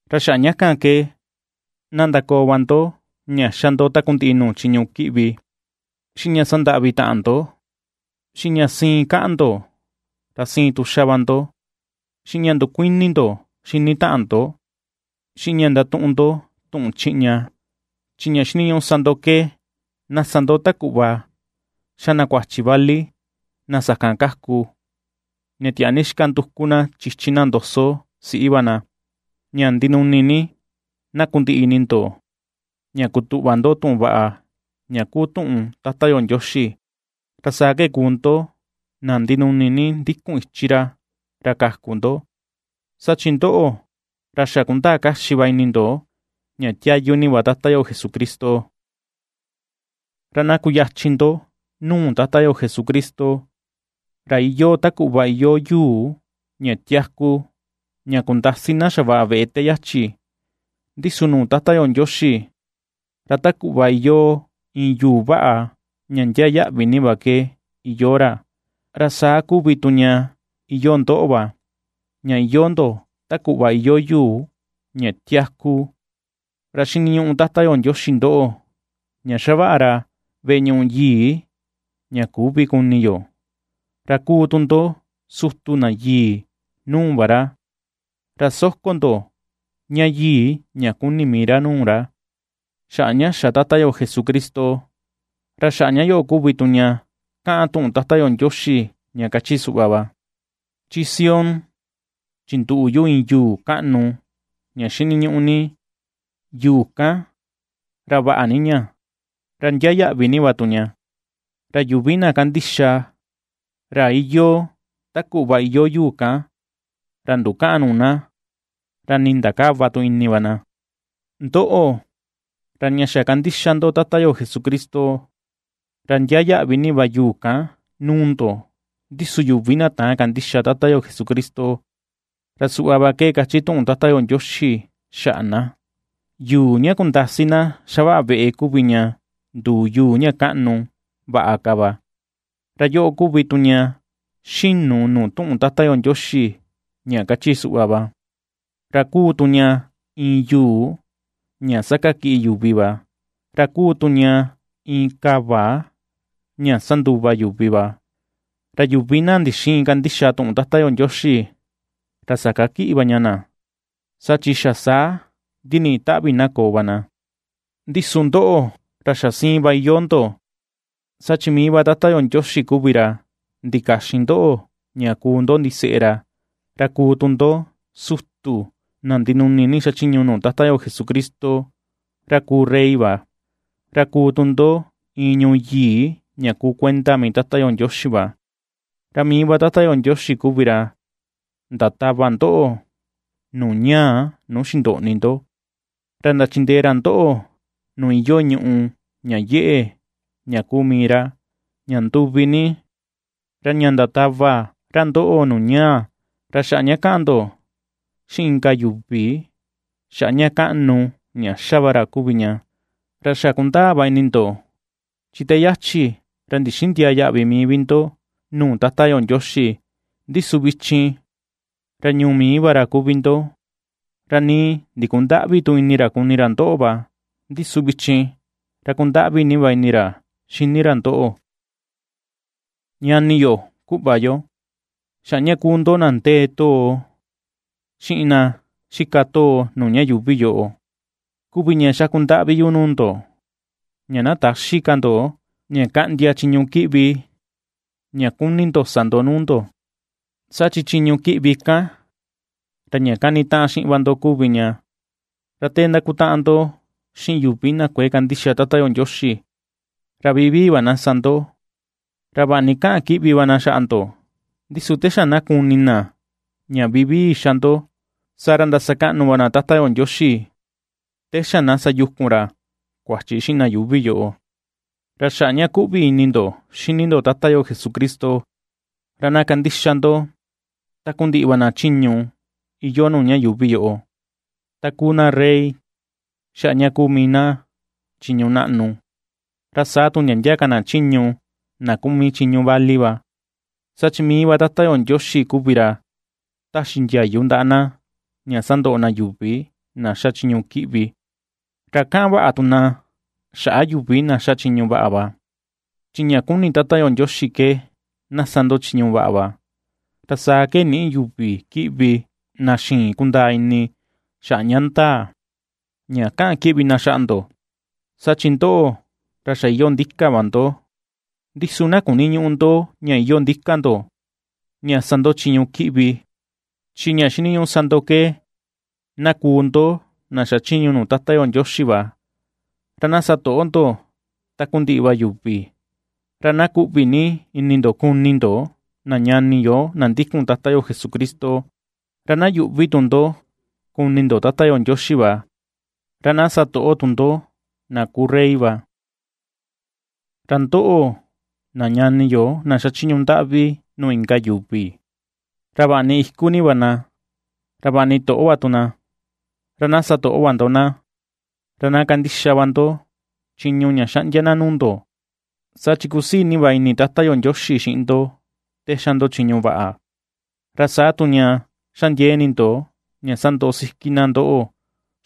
Ra xaꞌa ña kan ke, na ndakoo va ndo ña xa ndo takundiꞌi nuu chiñu kiꞌvi, xiꞌin ña sandaꞌvi taꞌan ndo, xiꞌin ña siin kaꞌan ndo ra siin tu xa va ndo, xiꞌin ña ndukuini ndo xini taꞌan ndo, xiꞌin ña ndatuꞌun ndo tuꞌun chiꞌña. Chi ña xiniñuꞌu sa ndo ke, na sa ndo ta kuꞌva xa na kuachi vali na sakan kaku ña tiaa ni xika nduku na chichin na ndoso siꞌi va na, ña ndinuni ni na kundiꞌi ini ndo ña kutuꞌva ndo tuꞌun vaꞌa ña kuu tuꞌun Tata yo Ndioxi, ra saa ke kuu ndo na ndinuni ni ndikun ichi ra, ra kaku ndo. Saa chi ndoꞌo, ra xa kundaa kaxi va ini ndo ña tiayu ni va Tata yo Jesucristo. Ra na kuyachin ndo nuu Tata yo Jesucristo, ra iyoo ta kuꞌva iyoo yuu ña tiaku ña kundasi na xavaꞌa veꞌe te yachi, ndi su nuu Tata yo Ndioxi ra ta kuꞌva iyoo iin yuu vaꞌa ña ndiaa yaꞌvi ni va ke iyoo ra. Ra saa kuvi tu ña iyoo ndoꞌo va, ña iyoo ndo ta kuꞌva iyoo yuu ña tiaku ra xiniñuꞌu Tata yo Ndioxi ndoꞌo, ña xavaꞌa ra veꞌe ñuꞌu yii ña küvi kuni yo. Ra kuu tu ndo sutu na yii nuu va ra. Ra soko ndo ña yii ña kuni mii ra nuu ra, xaꞌa ña xa Tata yo Jesucristo. Ra xaꞌa ña yoꞌo kuvi tu ña kaꞌan tuꞌun Tata yo Ndioxi ña kachi suꞌva va: Chi Sión chinduꞌu yu iin yuu kaꞌnu ña xiniñuꞌu ni, yuu kan ra vaꞌa ni ña, ra ndiaa yaꞌvi ni va tu ña; ra yuvi na kandixa ra iyoo ta kuꞌva iyoo yuu kan, ra ndukäꞌan nuu na, ra ni ndakäva tu ini va na. Ndoꞌo, ra ña xa kandixa ndo Tata yo Jesucristo, ra ndiaa yaꞌvi ni va yuu kan nuu ndo, ndi su yuvi na täan kandixa Tata yo Jesucristo, ra suꞌva va ke kachi tuꞌun Tata yo Ndioxi xaꞌa na: Yuu ña kundasi na xavaꞌa veꞌe kuvi ña, nduu yuu ña kaꞌnu vaꞌa ka va. Ra yoꞌo kuvi tu ña ^xinu nuu tuꞌun Tata yo Ndioxi ña kachi suꞌva va: Ra kuu tu ña iin yuu ña sakakiꞌi yuvi va, ra kuu tu ña iin kava ña sanduva yuvi va. Ra yuvi na ndixïin kandixa tuꞌun Tata yo Ndioxi, ra sakakiꞌi va ña na, saa chi xa saa ndiniꞌi taꞌvi na koo va na. Ndi su ndoꞌo, ra xa siin va iyoo ndo, saa chi mii va Tata yo Ndioxi kuvi ra ndikaxin ndoꞌo ña kuu ndo ndiseꞌe ra, ra kuu tu ndo sutu na ndinuni ni xachiñu nuu Tata yo Jesucristo, ra kuu rey va, ra kuu tu ndo iin ñuu yii ña kuu kuenda mii Tata yo Ndioxi va. Ra mii va Tata yo Ndioxi kuvi ra ndatava ndoꞌo nuu ñaa nuu xindoꞌni ndo, ra ndachindee ra ndoꞌo nuu iyoo ñùꞌù ña yeꞌe ña kuu mii ra, ña nduvi ni, ra ña ndatava ra ndoꞌo nuu ñaa, ra xaꞌa ña na kaꞌan ndo ^xiꞌin inka yuvi xaꞌa ña kaꞌnu ña ^xa va ra kuvi ña. Ra xa kundaa va ini ndo, chi te yachi ra ndixïndiaa yaꞌvi mii vi ndo nuu Tata yo Ndioxi, ndi su vichin ra ñuu mii va ra kuvi ndo; ra nii ndikundäꞌvi tu ini ra kuni ra ndoꞌo va, ndi su vichin, ra kundaꞌvi ni va ini ra xini ra ndoꞌo. Ñani yo, kuꞌva yo, xaꞌa ña kuu ndo na ndee too, xiꞌin na xika too nuu ña yuuvi yoꞌo kuvi ña xaku ndaꞌvi yu nuu ndo, ña na täxi ka ndo ña kaꞌndia chiñu kiꞌvi ña kuni ndo sa ndo nuu ndo, saa chi chiñu kiꞌvi kan, ra ña kanitaꞌan xiꞌin va ndo kuvi ña. Ra te ndakutaꞌan ndo xiꞌin yuvi na kuëe kandixa Tata yo Ndioxi, ra vivii va na sa ndo. Ra vaꞌa ni kaꞌan kiꞌvi va na xaꞌa ndo, ndi su te xa na kuni na ña vivii xa ndo, saa ra ndasakaꞌnu va na Tata yo Ndioxi te xa na sayukun ra kuachi xiꞌin na yuuvi yoꞌo. Ra xaꞌa ña kuꞌvi ini ndo xini ndo Tata yo Jesucristo, ra na kandixa ndo takundiꞌi va na chiñu iyoo nuu ña yuuvi yoꞌo; ta kuu na rey, xaꞌa ña kuu mii na chiñu naꞌnu, ra saa tu ndia ndia ka na chiñu na kuu mii chiñu vali va, saa chi mii va Tata yo Ndioxi kuvi ra ^taxi ndiayu ndaꞌa na ña sandoꞌo na yuvi na xa chiñu kiꞌvi, ra kaꞌan vaꞌa tu na xaꞌa yuvi na ^xa chiñu vaꞌa va. Chi ña kuni Tata yo Ndioxi ke na sa ndo chiñu vaꞌa va, ra saa ke nïꞌi yuvi kiꞌvi na xïin kundaa ini xaꞌa ña ndaa, ña kaꞌan kiꞌvi na xaꞌa ndo. Saa chi ndoꞌo, ra xa iyoo ndika va ndo, ndi su na kuniñüꞌu ndo ña iyoo ndika ndo ña sa ndo chiñu kiꞌvi, chi ña xiniñuꞌu sa ndo ke na kuu ndo na xachiñu nuu Tata yo Ndioxi va. Ra na satoꞌo ndo takundiꞌi va yuvi. Ra na kuꞌvi ni ini ndo kuni ndo na ñani yo na ndikun Tata yo Jesucristo. Ra na yuꞌvi tu ndo kuni ndo Tata yo Ndioxi va, ra na satoꞌo tu ndo na kuu rey va. Ra ndoꞌo, na ñani yo na xachiñu ndaꞌvi nuu inka yuvi, ra vaꞌa ni iku ni va na, ra vaꞌa ni toꞌo va na, ra na satoꞌo va ndo na, ra na kandixa va ndo chiñu ña xaꞌndia na nuu ndo. Saa chi kusii ni va ini Tata yo Ndioxi xiꞌin ndo te xa ndo chiñu vaꞌa, ra saa tu ña xa ndiee ini ndo ña sandoꞌo siki na ndoꞌo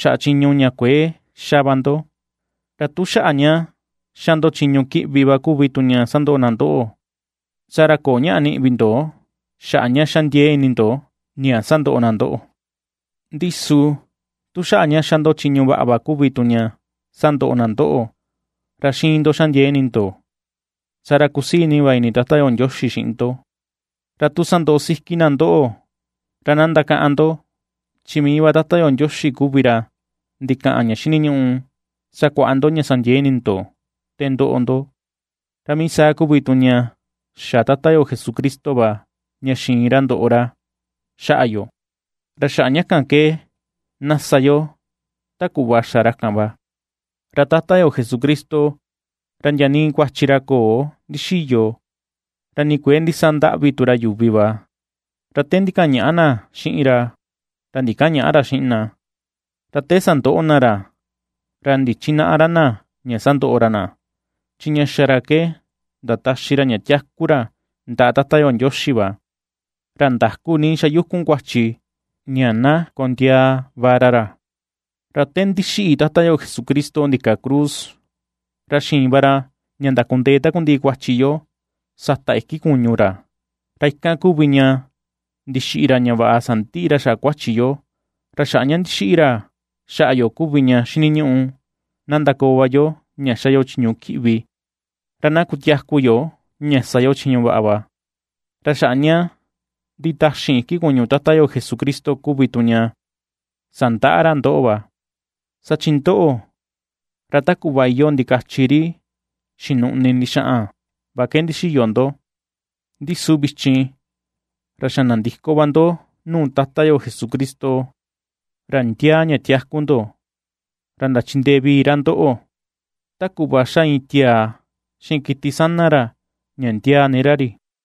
xaꞌa chiñu ña kuëe xa va ndo. Ra tu xaꞌa ña xa ndo chiñu kiꞌvi va kuvi tu ña sandoꞌo na ndoꞌo, saa ra köo ñaꞌa niꞌi vi ndo xaꞌa ña xa ndiee ini ndo ña sandoꞌo na ndoꞌo, ndi su tu xaꞌa ña xa ndo chiñu vaꞌa va tu kuvi ña sandoꞌo na ndoꞌo, ra xiin ndo xa ndiee ini ndo, saa ra kusii ni va ini Tata yo Ndioxi xiꞌin ndo. Ra tu ^sandoꞌo siki na ndoꞌo, ra na ndakaꞌan ndo, chi mii va Tata yo Ndioxi kuvi ra ndikaꞌan ña xiniñuꞌu sakuaꞌa ndo ña sa ndiee ini ndo te ndoꞌo ndo. Ra mii saa kuvi tu ña xa Tata yo Jesucristo va ña xiin ra ndoꞌo ra xaꞌa yo, ra xaꞌa ña kan ke na sa yo ta kuꞌva xa ra kan va. Ra Tata yo Jesucristo ra ndia nii kuachi ra köo ndixiyo, ra nii kuëe ndisandaꞌvi tu ra yuvi va; ra te ndikaꞌan ña̱ꞌà na xiꞌin ra, ra ndikäꞌan ña̱ꞌà ra xiꞌin na; ra te sandoꞌo na ra, ra ndichinäꞌa ra na ña sondoꞌo ra na, chi ña xa ra ke ndataxi ra ña tiaku ra ndaꞌa Tata yo Ndioxi va, ra ndaku ni xayukun kuachi ña na kondiaa va ra ra. Ra te ndixiꞌi Tata yo Jesucristo ndika cruz, ra xiin va ra ña ndakundee takundiꞌi kuachi yo, sata iki kuñu ra, ra ikan kuvi ña ndixiꞌi ra ña vaꞌa sandiꞌi ra xaꞌa kuachi yo, ra xaꞌa ña ndixiꞌi ra xaꞌa yo kuvi ña xiniñuꞌu na ndakoo va yo ña xa yo chiñu kiꞌvi, ra na kutiaku yo ña sa yo chiñu vaꞌa. Ra xaꞌa ña nditaxin iki kuñu Tata yo Jesucristo kuvi tu ña sandaꞌa ra ndoꞌo va. Saa chi ndoꞌo, ra ta kuꞌva iyoo ndikachi ri xinuꞌni ndixaꞌan va ke ndixiyo ndo, ndi su vichin, ra xa nandiko va ndo nuu Tata yo Jesucristo, ra ndiaa ña tiaku ndo, ra ndachindee vii ra ndoꞌo, ta kuꞌva xa iin tiaa xiꞌin kiti sana ra ña ndiaa ni ra ri.